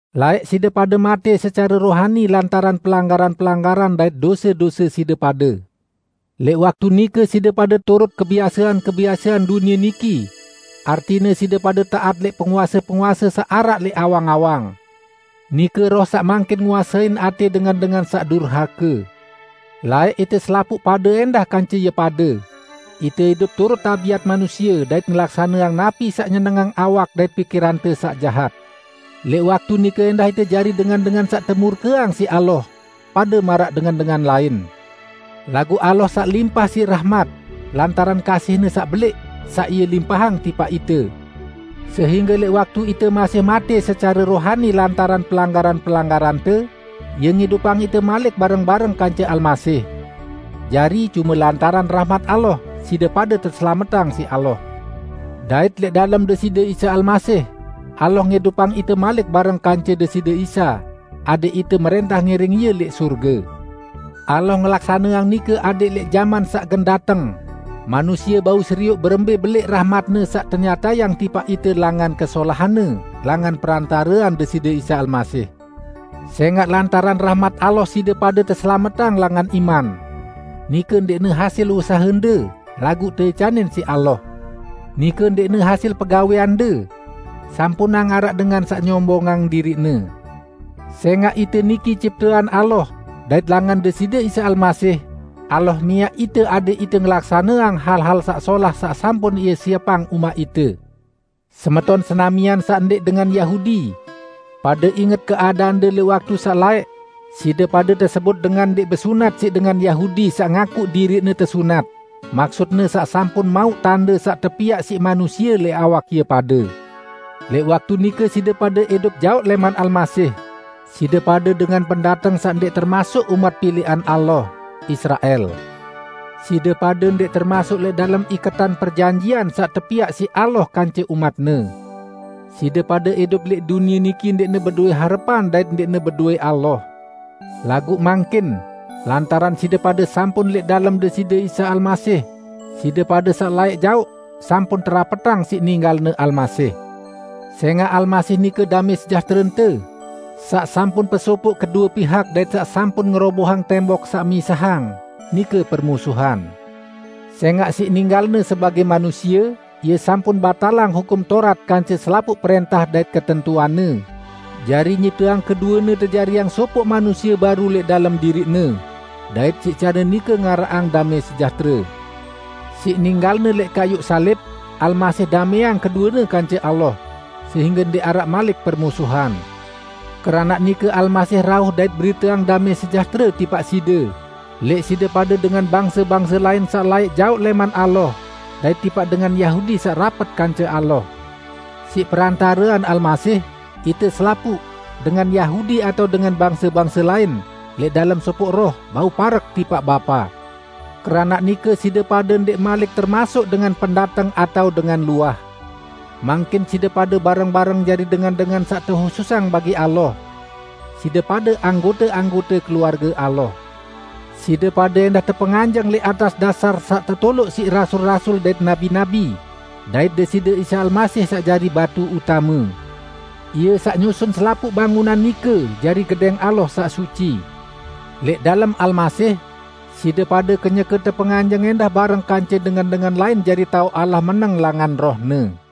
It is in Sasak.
Laẽq side pade matẽ secare rohani lantaran pelanggaran-pelanggaran dait dose-dose side pade. Lẽq waktu nike side pade turut kebiasean-kebiasean dunie niki; artine side pade taat lẽq penguase-penguase saq araq lẽq awang-awang, nike roh saq mangkin nguasein atẽ dengan-dengan saq durhake. Laẽq ite selapuq pade ẽndah kance ie pade; ite idup turut tabiat manusie dait ngelaksaneang napi saq nyenengang awak dait pikirante saq jahat. Lẽq waktu nike ẽndah ite jari dengan-dengan saq temurkeang siq Allah, pade maraq dengan-dengan lain. Laguq Allah saq limpah siq rahmat, lantaran kasih-Ne saq belẽq, saq Ie limpahang tipaq ite, sehingge lẽq waktu ite masih matẽ secare rohani lantaran pelanggaran-pelanggarante, Ie ngidupang ite malik bareng-bareng kance Almasih. Jari, cume lantaran rahmat Allah, side pade teselametang siq Allah. Dait lẽq dalem Deside Isa Almasih, Allah ngidupang ite malik bareng kance Deside Isa, adẽq ite mrẽntah ngiring Ie lẽq sorge. Allah ngelaksaneang nike adẽq lẽq jaman saq gen dateng, manusie bau serioq berembẽ belẽq rahmat-Ne saq tenyatayang tipaq ite langan kesolahan-Ne langan perantarean Deside Isa Almasih. Sẽngaq lantaran rahmat Allah side pade teselametang langan iman; nike ndẽqne hasil usahende, laguq teicanin siq Allah, nike ndẽqne hasil pegawẽande: Sampunang araq dengan saq nyombongang diriqne. Sẽngaq ite niki ciptean Allah, dait langan Deside Isa Almasih, Allah miaq ite adẽq ite ngelaksaneang hal-hal saq solah saq sampun Ie siepang umaq ite. Semeton senamian saq ndẽq dengan Yahudi! Pade inget keadaande lẽq waktu saq laẽq: Side pade tesebut "dengan ndẽq besunat", siq dengan Yahudi saq ngaku diriqne tesunat (maksutne saq sampun mauq tande saq tepiaq siq manusie lẽq awak ie pade). Lẽq waktu nike side pade idup jaoq lẽman Almasih, side pade dengan pendateng saq ndẽq termasuk umat pilẽqan Allah, Israel. Side pade ndẽq termasuk lẽq dalem iketan perjanjian saq tepiaq siq Allah kance umat-Ne. Side pade idup lẽq dunie niki ndẽqne bedowẽ harepan dait ndẽqne bedowẽ Allah. Laguq mangkin, lantaran side pade sampun lẽq dalem Deside Isa Almasih, side pade saq laẽq jaoq, sampun terapetang siq ninggalne Almasih. Sẽngaq Almasih nike damẽ sejahterente, saq sampun pesopoq kedue pihak dait saq sampun ngerobohang tembok saq misahang, nike permusuhan. Sẽngaq siq ninggal-Ne sebagẽ manusie Ie sampun batalang Hukum Taurat kance selapuq prẽntah dait ketentuanne, jari nyipteang keduene tejariang sopoq manusie baru lẽq dalem diriq-Ne, dait siq care nike ngaraqang damẽ sejahtere. Siq ninggal-Ne lẽq kayuq salib, Almasih damẽang keduene kance Allah, sehingge ndẽq araq malik permusuhan. Keranaq nike Almasih rauh dait beriteang damẽ sejahtere tipaq side; lẽq side pade dengan bangse-bangse lain saq laẽq jaoq lẽman Allah, dait tipaq dengan Yahudi saq rapet kance Allah. Siq perantarean Almasih, ite selapuq -- dengan Yahudi atao dengan bangse-bangse lain -- lẽq dalem sopoq Roh, bau parek tipaq Bapa. Keranaq nike, side pade ndẽq malik termasuk dengan pendateng atao dengan luah. Mangkin side pade bareng-bareng jari dengan-dengan saq tehususang bagi Allah. Side pade anggote-anggote keluarge Allah. Side pade ẽndah tepenganjeng lẽq atas dasar saq tetoloq siq rasul-rasul dait nabi-nabi, dait Deside Isa Almasih saq jari batu utame. Ie saq nyusun selapuq bangunan nike jari Gedẽng Allah saq suci. Lẽq dalem Almasih, side pade kenyeke tepenganjeng ẽndah bareng kance dengan-dengan lain jari taoq Allah meneng langan Roh-Ne.